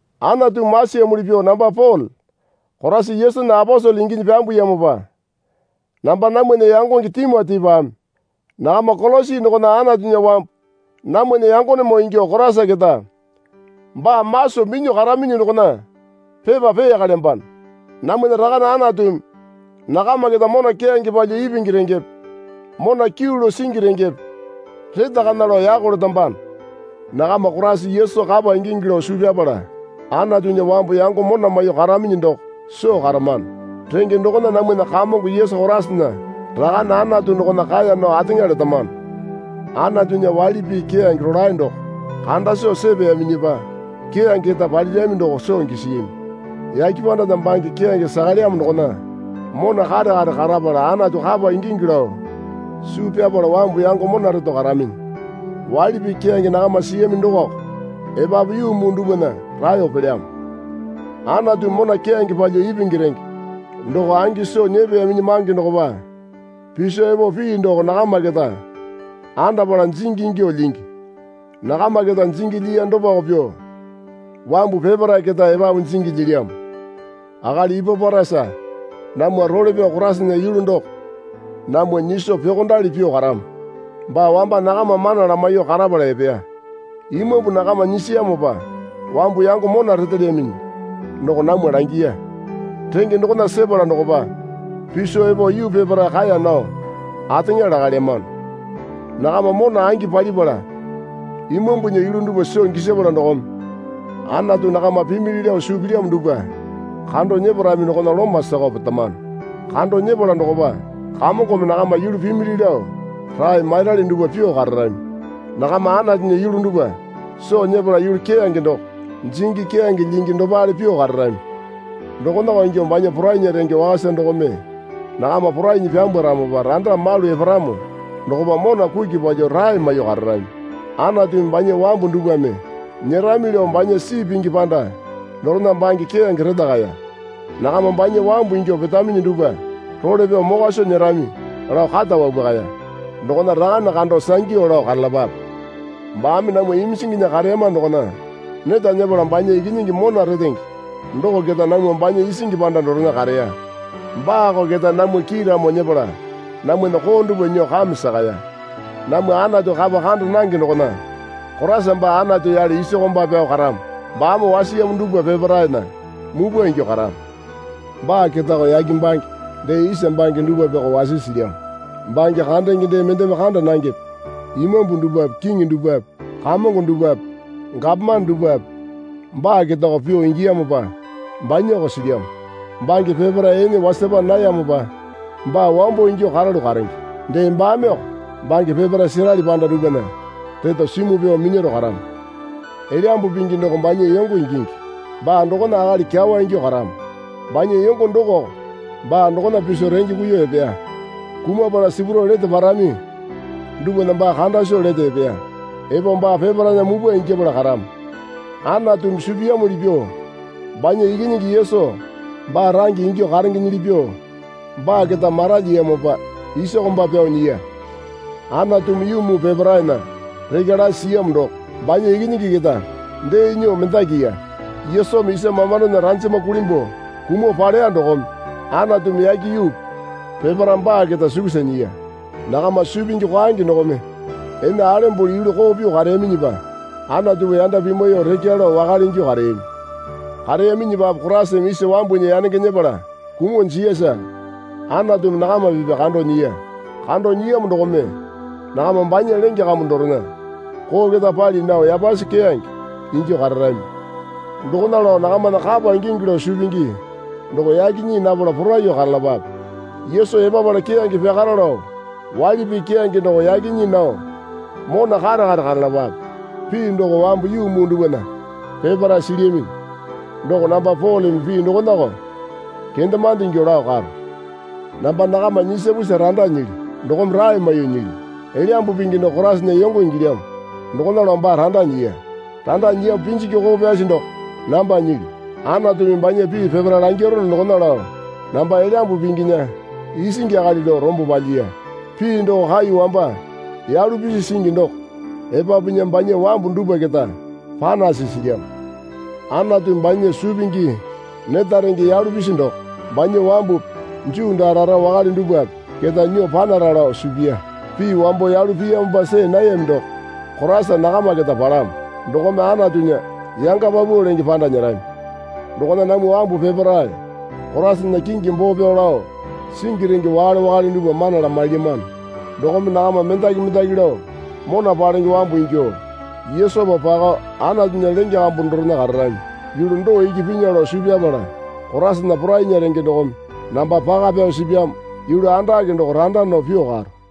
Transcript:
Anatumi masiyamuli pyuo namba Pole Koraisa Yesunya aposele inginyi pyambuyamopa namba namwana yangonge Timotipame nakama Kolosi dokona Anatunya wambu namwana yangonemoo ingyuo Koraisa keta baa maso minyuo karaminyi dokona pepa peyakalyambano. Namwana Rakane Anatumi nakama keta mona keyange palyuo ipingi rengepe mona kyuu lao singi rengepe retakana lao yako letambano. Nakama Koraisa Yesu kapa ingingi lao suu pyapala Anatunya wambu yango mona maiyuo karaminyi doko soo karamano. Renge dokona namwana Kamongo Yesu Koraisana Rakane Anatu dokona kaeya nao ateŋa letamano. Anatunya waili pii keyange rolae doko kanda soo sepeyaminyipa keyange keta palirami doko soo gisiyami. Yake pandana bange keyange sakalyamo dokona mona kare kare karapala Anatu kapa ingingi lao suu pyapala wambu yango mona reto karaminyi. Waili pii keyange nakama siyami dokoko epapu yuu muu dupwana raeyo pelyamo. Anatumi mona keyange palyuo ipingi renge doko angi soo nyepeyaminyi mange dokopa piso epo pii doko nakama keta andapala jingi ingyuo lyingi. Nakama keta jingi lyiya dopako pyuo wambu peparae keta epapu jingi lyilyamo. Akali Ipaporasa namwa role pyao Koraisana yulu doko namwa nyiso pyuokondali pyuo karamo. Baa wamba nakama mana lamaiyuo karapala epeya. Imambu nakama nyisiyamopa wambu yango mona retelyaminyi doko namwa langiya. Renge dokona sepala dokopa piso epo yuu peparae kaeya nao ateŋa lakalyamano. Nakama mona angi palipala imambunya yulu dupwa soo gisapala dokome Anatu nakama pimili lao suu pilyamo dupwa kando nyeparami dokona loma sakao petamano. Kando nyepala dokopa Kamongome nakama yulu pimili lao rae mairali dupwa pyuo kararami. Nakama Anatunya yulu dupwa soo nyepala yulu keyange doko jingi keyange lyingi dopale pyuo kararami. Dokonako ingyuo banya porainya renge wakasa dokome nakama porainyi pyambwaramopa randa malu eparamo dokopa mona kuki palyuo rae maiyuo kararami. Anatumi banya wambu dupwame nyerami lao banya sii pingi panda dorena bange keyange retakaya. Nakama banya wambu ingyuo petaminyi dupwa role pyao mokwa soo nyerami lao kata wapwakaya. Dokona Rakane kando sangyu lao karalapape. Baame namwa iminjinginya kareyama dokona neta nyepala banya Ikinyingi mona retenge doko keta namwa banya isingi panda dorena kareya. Baako keta namwa kiiramo nyepala namwana koo dupwa nyuo kame sakaya. Namwa Anatu kapa kanda nange dokona Koraisa baa Anatu yale isa komba pyao karamo baame wasiyamo dupwa peparaena mupwa ingyuo karamo. Baa ketako yake bange dee isa bange dupwapeko wasisi silyamo. Bange kandenge dee mendeme kanda nangepe Imambu dupwape kiŋi dupwape kamongo dupwape gapomane dupwape baa ketako pyuo ingiyamopa banyako silyamo. Bange peparae ene wasapa nayamopa baa wambo ingyuo karalu karenge. Dee baameko bange peparae serali panda dupwana reto simuo pyao minyaro karamo. Elyambu Pingi doko banya yongo ingingi. Baa dokona akali kyawa ingyuo karamo. Banya yongo dokoko baa dokona piso renge kuiyuo epeya. Kumapala sipurao lete parami dupwana baa kanda soo lete epeya. Epo baa peparaena mupwa ingyapala karamo. Anatumi suu piyamuli pyuo banya Ikinyingi Yesu baa range ingyuo karengenyili pyuo baa keta maralyiyamopa isa komba pyao nyiya. Anatumi yuu muu peparaena rekya lasi siyamo doko banya Ikinyingi keta dee nyuo mendakiya. Yesumi isa mamandona ranjama kulimbuo kumuo paleya dokome Anatumi yake yuupi peparae baa keta sukusa nyiya. Nakama suu pingi kwaenge dokome ene alembole yulu koo pyuo kareyaminyipa Anatupa yanda pimwaiyuo rekya lao wakale ingyuo kareyami. Kareyaminyipape Koraisame isa wambunya yanenge nyepala kumuo jiyasa Anatumi nakama pipya kando nyiya. Kando nyiyamo dokome nakama banya lenge kambu dorena koo keta pali nao yapasi keyange ingyuo kararami. Dokona lao nakamana kapa ingingi lao suu pingi doko yake nyii napala poraiyuo karalapape. Yesu epapala keyange pyakara lao waili pii keyange doko yake nyii nao mona kare kare karalapape. Pii doko wambu yuu muu dupwana peparae silyaminyi. Doko namba Poleme pii dokonako kendemande ingyuo lao karo. Namba nakama nyisapusa randa nyilyu dokome rae maiyuo nyilyu. Elyambu Pingi doko Koraisana yongo ingilyamo dokona lao baa randa nyiya. Randa nyiyamo pinjingi koko pyasi doko namba nyilyu. Anatumi banya pii peparae langirono dokona lao namba Elyambu Pinginya isingi akali lao rombo palyiya. Pii doko kai wamba yalu pisi singi doko epapunya banya wambu dupwa keta panasi silyamo. Anatumi banya suu pingi neta renge yalu pisi doko, banya wambupi Juu daa rara wakale dupwape keta nyuo panara lao suu piya. Pii wambo yalu piyamopa see nayami doko Koraisa nakama keta palamo. Dokome Anatunya yanga paupau lenge panda nyerami. Dokona namwa wambu peparae Koraisana kingi boo pyao lao singi renge wakale wakale dupwa mana lamailyamano. Dokome nakama mendaki mendaki lao mona palenge wambu ingyuo Yesupa pakao Anatunya lenge kambu dorena kararami. Yulu doo iki pinya lao suu pyapala Koraisana porainya renge dokome namba paka pyao sipyamo yulu andake doko randa nao pyuo karo.